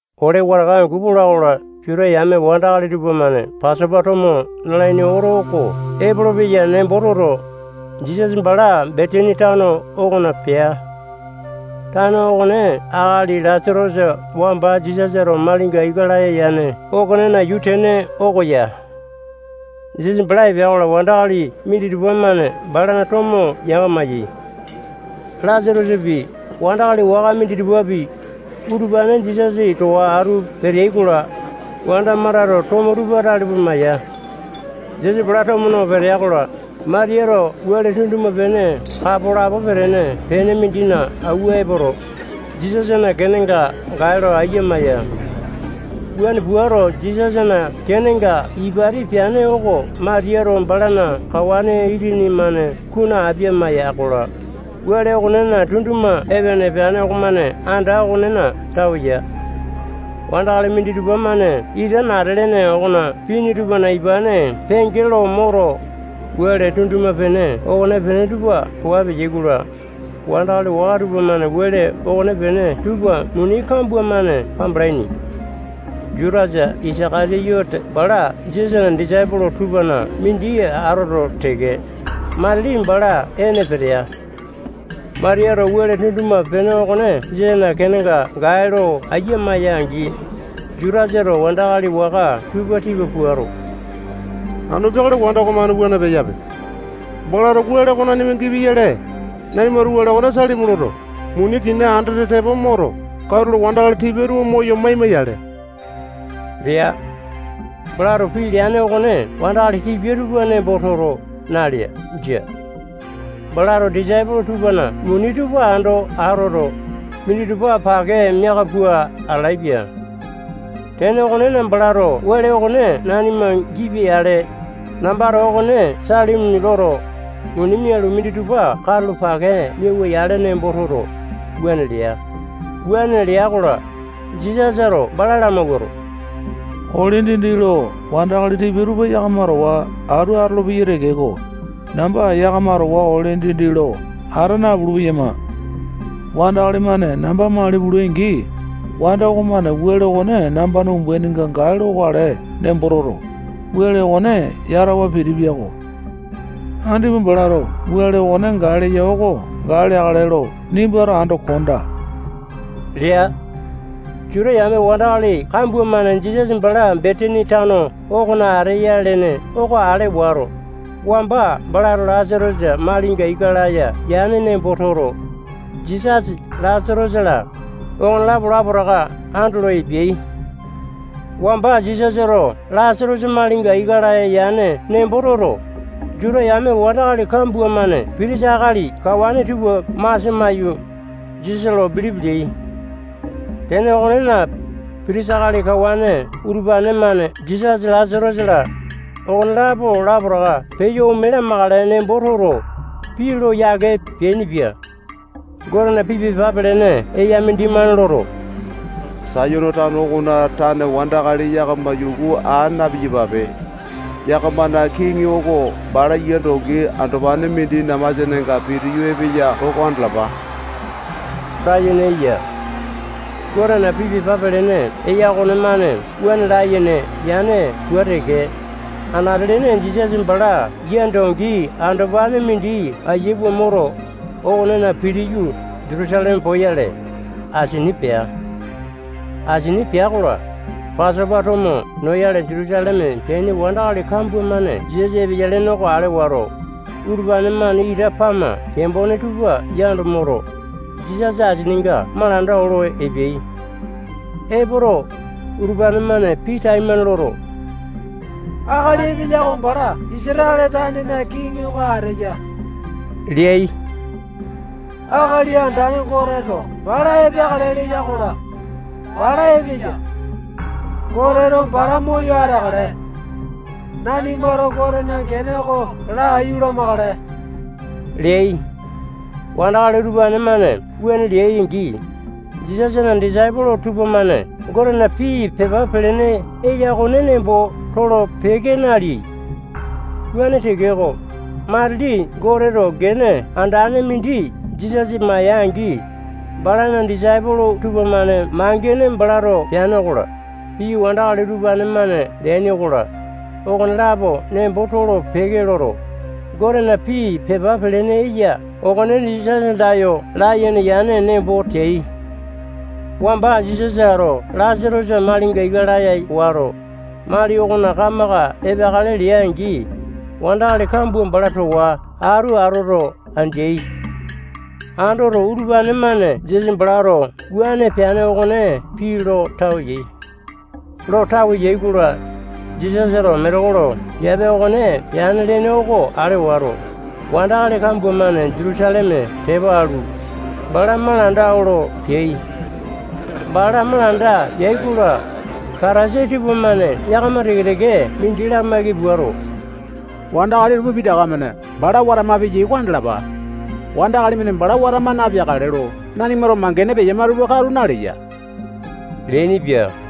Ole wataka angu pola-kola, Juta yame wandakali tupamane Pasopa tomo nalaini oto oko epolopeya nembo toto, Jisasa bala Betani tano okona pea. Tano okone akali Lasatosa wamba Jisasato malinga ika laya yane okonena yuu tene oko ya. Jisasa bala epea-kola, wandakali minditupa-mane balana tomo yanga-maiyai. Lasatosapi, wandakali waka minditupapi, utupane Jisasa towa atu peteai-kola, wanda Matato tomo tupa tale pua maya. Jisasa bala tomo no petea-kola, Matiyato wele tunduma-pene kapo lapo petene pene mindina awua epoto, Jisasana kenenga gae lo ayia maya. Wuane puato, Jisasana kenenga ipati peane oko Matiyato balana kawane itini-mane kunu apia maya-kola, wele okonena tunduma epene peane okomane anda okonena tawe ya. Wandakali minditupa-mane ita nata lene okona pini tupana ipane penge lo moto, wele tunduma-pene okonepene tupa waa peyai-kola, wandakali waka tupamane wele okonepene tupa muni kambua-mane kambalaini. Jutasa Isaka-tiyote bala Jisasana disaipolo tupana mindi atoto teke, matili bala ene petea. Matiyato wele tunduma-pene okone Jisasana kenenga gae lo ayia maya-angi, Jutasato wandakali waka tupa tipa puato, anu peakale wanda okomane wuane peyape. Balato wele oko nanima gipia-yale, nanimato wele okone salimi loto, muni kina andete tepo moto, katulo wandakali tipia tupa moyo maima-yale lea. Balato pii leane okone wandakali tipia tupa nembo toto, nalea. Jia. Balato disaipolo tupana muni tupa ando atoto, minditupa pake miaka pua atalaepia. Tene okonena, balato wele okone nanima gipia-yale, nambato okone salimi loto, muni mialu, minditupa katulo pake miawa-yale nembo toto, wuane lea. Wuane lea-kola, Jisasato bala lamawuato, ole dindi lo wandakali tipia tupa yakama towa atu atolopeyai tekeko, namba yakama towa ole dindi lo ata napulu-peyama. Wandakali-mane namba mali pulai-angi, wanda okomane wele okone nambana umbaininga gae lokale nembo toto, wele okone yatawa pitipia-ko. Andipa balato wele okone gae leya oko gae leakale lo nimbato ando kondaa lea. Juta yame wandakali kambua-mane Jisasa bala Betani tano okona ateya lene oko ale wato, wamba balato Lasatosa malinga ika laya yane nembo toto, Jisasa, Lasatosa-la, okonelapo lapotaka andolo epeai. Wamba Jisasato Lasatosa malinga ika laya yane nembo toto, Juta yame wandakali kambua-mane pitisa akali kawane tupa masia maiyu, Jisasa lo bilipi leai. Tene okonena, pitisa akali kawane utupane-mane Jisasa, Lasatosa-la, okonelapo lapotaka peyo ome lamakale nembo toto, pii lo yake peainipia. Gotena pii pepa pelene eya mindimane loto, Sayone tano okona tane wandakali yakama yuku aa na-piyapape. Yakamana kiŋi oko bala yia dongi andopane mindina masianenga pitiyu epeya oko andalapa layene eya. Gotena pii pepa pelene eya okonemane wuane layene yane pua teke, anate-lene Jisasa bala yia dongi andopane mindi ayia pua moto, okonena pitiyu, Jutusaleme poyale, asini pea. Asini pea-kola, Pasopa tomo noyale Jutusaleme peaini wandakali kambua-mane Jisasa epeya lene oko ale wato, utupane-mane ita pama kembone tupa yando moto, Jisasa asininga malanda olo epeai. Epoto, utupane-mane pii taimane loto, akali epeya oko bala Isatale tanena kiŋi oko ateya leai. Akali Andane Goteto bala epeakale leya-kola, bala epeya. Goteto bala moyo ateakale. Nanimato Gotena gene oko laiyu lamakale leai. Wandakali utupane-mane wuane leai-angi, Jisasana disaipolo tupamane Gotena pii pepa pelene eya okone nembo tolo-peke naleai. Wuane tekeko, matili Goteto gene andane mindi Jisasa maya-angi, balana disaipolo tupamane mangene balato peane okola, pii wandakali utupane-mane leaini okola, okonelapo nembo tolo-peke loto, Gotena pii pepa pelene eya okone Jisasa andayo layene yane nembo teai. Wamba Jisasato Lasatosa malinga ika laya wato, mali okona kamaka epeakale lea-angi, wandakali kambua bala towa atu atoto, andeai. Andoto, utupane-mane Jisasa balato wuane peane okone pii lo tawe yai. Lo tawe yai-kola, Jisasato metekolo piape okone peane lene oko ale wato, wandakali kambua-mane Jutusaleme tepa alu, bala malanda olo peai. Bala malanda yai-kola, Patasai tupamane yakama teke-teke mindi lamaiki puato, wandakali tupa pitaka-mane bala watama peyai oko andalapa. Wandakali-mane bala watama napeakale lo nanimato mangene peyama tupa katu naleya leainipia.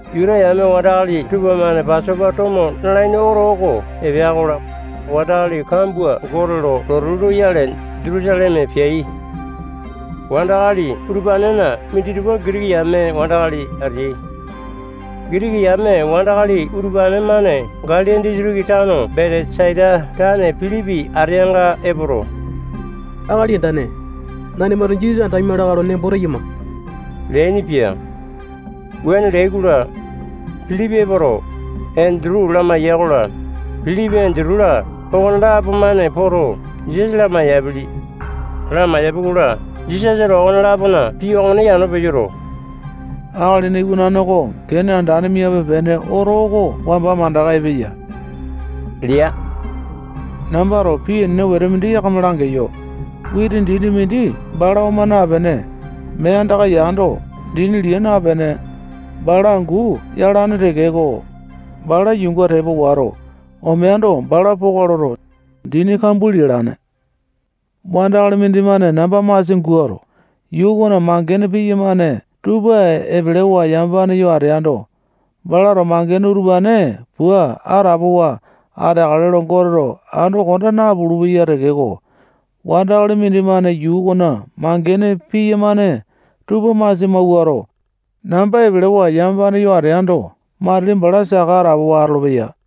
Juta yame wandakali tupamane Pasopa tomo nalaini oto oko epea-kola, wandakali kambua Gote lo lotu loyale Jutusaleme peai. Wandakali utupanena minditupa Gitiki yame wandakali ateai. Gitiki yame wandakali utupane-mane Galili disitiki tano Betesaita tane Pilipi ateanga epoto, akali andane, nanimato Jisasa andaima lakae lo nembo teyama leainipia. Wuane leai-kola, Pilipi epoto, Endutu lamaiya-kola, Pilipi, Endutu-la, okonelapo-mane poto, Jisasa lamai-yapili. Lamaiyapi-kola, Jisasato okone-lapona pii okone yano peyoto, Akalina Iwanane oko gene andane miape-pene oto oko wamba mandaka epeya lea. Nambato pii enene wete mindi yakama langeyo. Witi dini mindi bala oma napene, mee andaka yando, dini lia napene, bala angu yalane tekeko, bala yuunga tepa wato, omeando, bala poka loto, dini kambua lialane. Wandakali mindimane namba masia mawuato, yuu okona mangene piyamane tupa epelewa yamapane yo ateando, balato mangene utupane pua atapowa ateakale lo Goteto ando konda napulu-peya tekeko, wandakali mindimane yuu okona mangene piyamane tupa masia mawuato, namba epelewa yamapane yo ateando, matili bala saka atapowa atolopeya.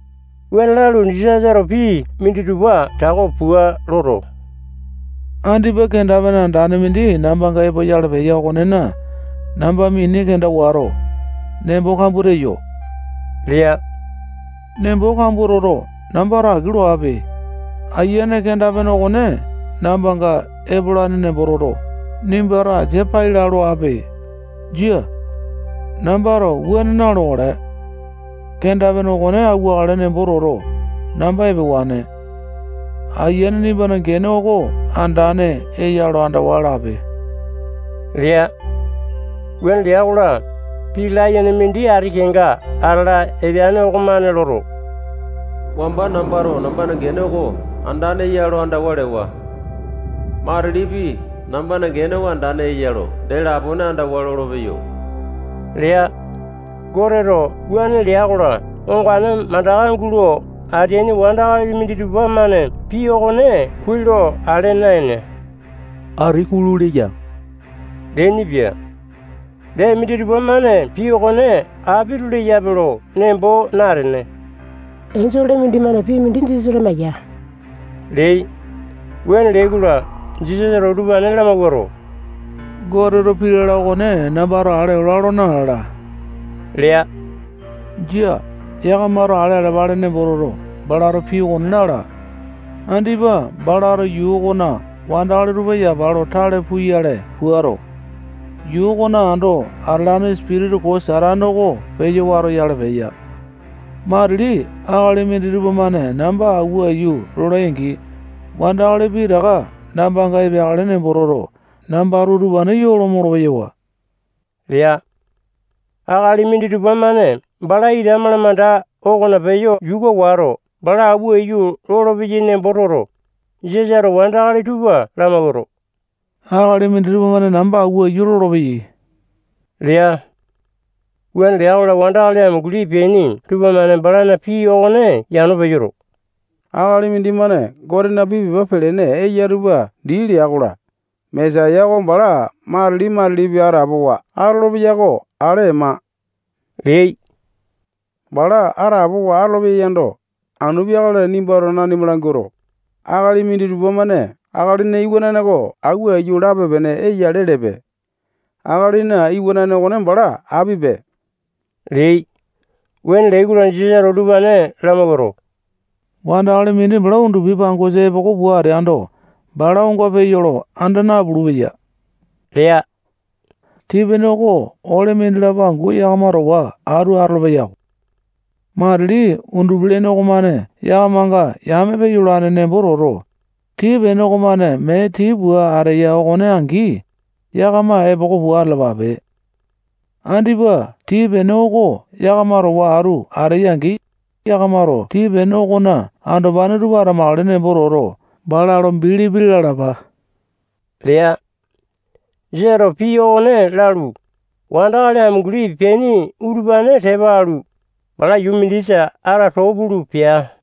Wuane lalu, Jisasato pii minditupa tako pua loto, andipa kenda-pene andane mindi nambanga epoyale peya okonena, namba mini kenda wato, nembo kambua teyo lea. Nembo kambua toto, nambato aki loape. Ayiane, kenda-pene okone nambanga epolane nembo toto, nimbato asia pai laa loape. Jia. Nambato wuane na-lokale. Kenda-pene okone awuakale nembo toto, namba epewane. Ayiane, nimbana gene oko andane eya lo andawa lape lea. Wuane lea-kola, pii layene mindi ati kenga atala epeane okomane loto, wamba nambato nambana gene oko andane eya lo andawa lewa. Matilipi, nambana gene oko andane eya lo dee lapone andawa lolopeyo lea. Goteto wuane lea-kola, ongane mandaka gulo ateaini wandakali minditupa-mane pii okone kuai lo ale naene, ati kulu leya leainipia. Dee, minditupa-mane pii okone apito leyape lo nembo natene, enjole mindimane pii mindi Jisasa lamaeya leai. Wuane leai-kola, Jisasato utupane lamawuato, Goteto pii lala okone nambato ale ola nalala lea. Jia. Yakamato ale alapale nembo toto, balato pii okone lala. Andipa balato yuu okona wandakali tupa yapa lo tale puyale puato, yuu okona ando atalane sipitisa koo Satane oko peyo watoyale peya. Matili akali minditupa-mane namba auwa aiyu lolai-angi, wandakali pitaka nambanga epeakale nembo toto, nambato utupane yoo lo molo-peyawa lea. Akali minditupa-mane bala ita malamanda okona peyo yuka wato, bala auwa aiyu lolopeyai nembo toto, Jisasato wandakali tupa lamawuato, akali minditupa-mane namba awua aiyu lolopeyai lea. Wuane lea-kola, wandakali amunguli peaini tupamane balana pii okone yano peyoto, akali mindimane Gotena pii pepa pelene eya tupa dii lea-kola, Mesaya oko bala matili-matilipi atapowa atolopeya oko ale ema leai. Bala atapowa atolopeya yando, anu peakale nimbato nanima languato, akali minditupa-mane Akalina Iwanane oko awua aiyu lape-pene eya lelepe. Akalina Iwanane okone bala apipe leai. Wuane leai-kola, Jisasato utupane lamawuato, wandakali mindi bala undupi pangosa epoko pua ateando, bala onga peya lo anda napulu-peya lea. Tii-pene oko ole mindilapo angu yakama towa atu atolo-peyako. Matili undupi-lene okomane yakamanga yame peyolane nembo toto, tii-pene okomane mee tii pua ateya okone angi, yakama epoko pua atalapape. Andipa tii-pene oko yakama towa atu ateya-angi, yakamato tii-pene okona andopane tupa atamakale nembo toto, bala lo bilipi lalapa lea. Jisasato pii okone lalu, wandakali amunguli peaini utupane tepa alu, bala yuu mindisa ata too pulu pea.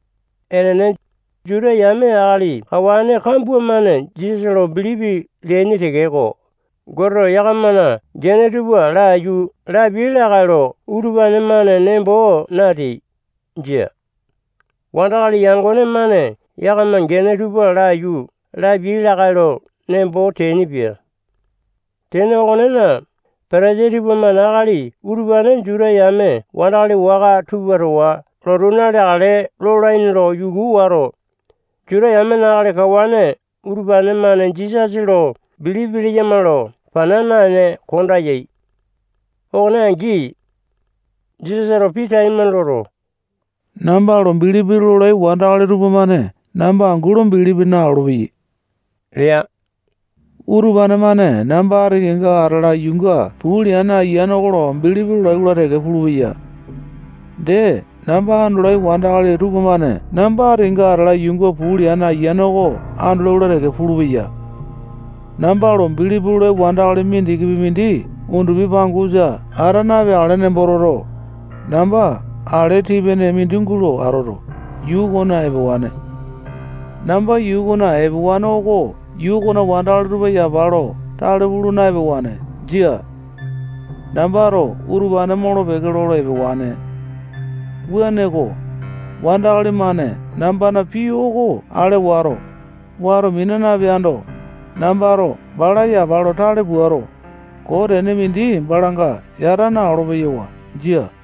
Enene, Juta yamena akali kawane kambua-mane Jisasa lo bilipi leaini tekeko, Goteto yakamana gene tupa laiyu lapia lakae lo utupane-mane nembo nateai. Jia. Wandakali yangone-mane yakamana gene tupa laiyu lapiai lakae lo nembo teainipia. Tene okonena, Patasai tupamane akali utupane Juta yame wandakali waka tupa towa lotu naleakale lolaini lo yuku wato, Juta yamena akali kawane utupane-mane Jisasa lo bilipi leyama lo pana naene konda yai. Okone angi, Jisasato pii taimane loto, namba lo bilipi lolai wandakali tupamane namba angu lo bilipi nalolo-peyai lea. Utupane-mane namba ati kenga atala yuunga puu leane Ayiane oko lo bilipi lolai-kola teke pulupeya. Dee, namba andolai wandakali tupamane namba ati kenga atala yuunga puu leane Ayiane oko andolai-kola teke pulupeya. Namba lo bilipi lolai wandakali mindikipi mindi undupi pangosa ata napeakale nembo toto, namba ale tii-pene mindi gulo atoto, yuu okona epewane. Namba yuu okona epewane oko yuu okona wandakali tupa yapa lo tale pulu na-epewane. Jia. Nambato utupane molo-peke lolo epewane. Wuaneko, wandakali-mane nambana pii oko ale wato, wato mina napeando, nambato bala yapa lo tale puato, koo tene mindi balanga yata na-olopeyo. Jia.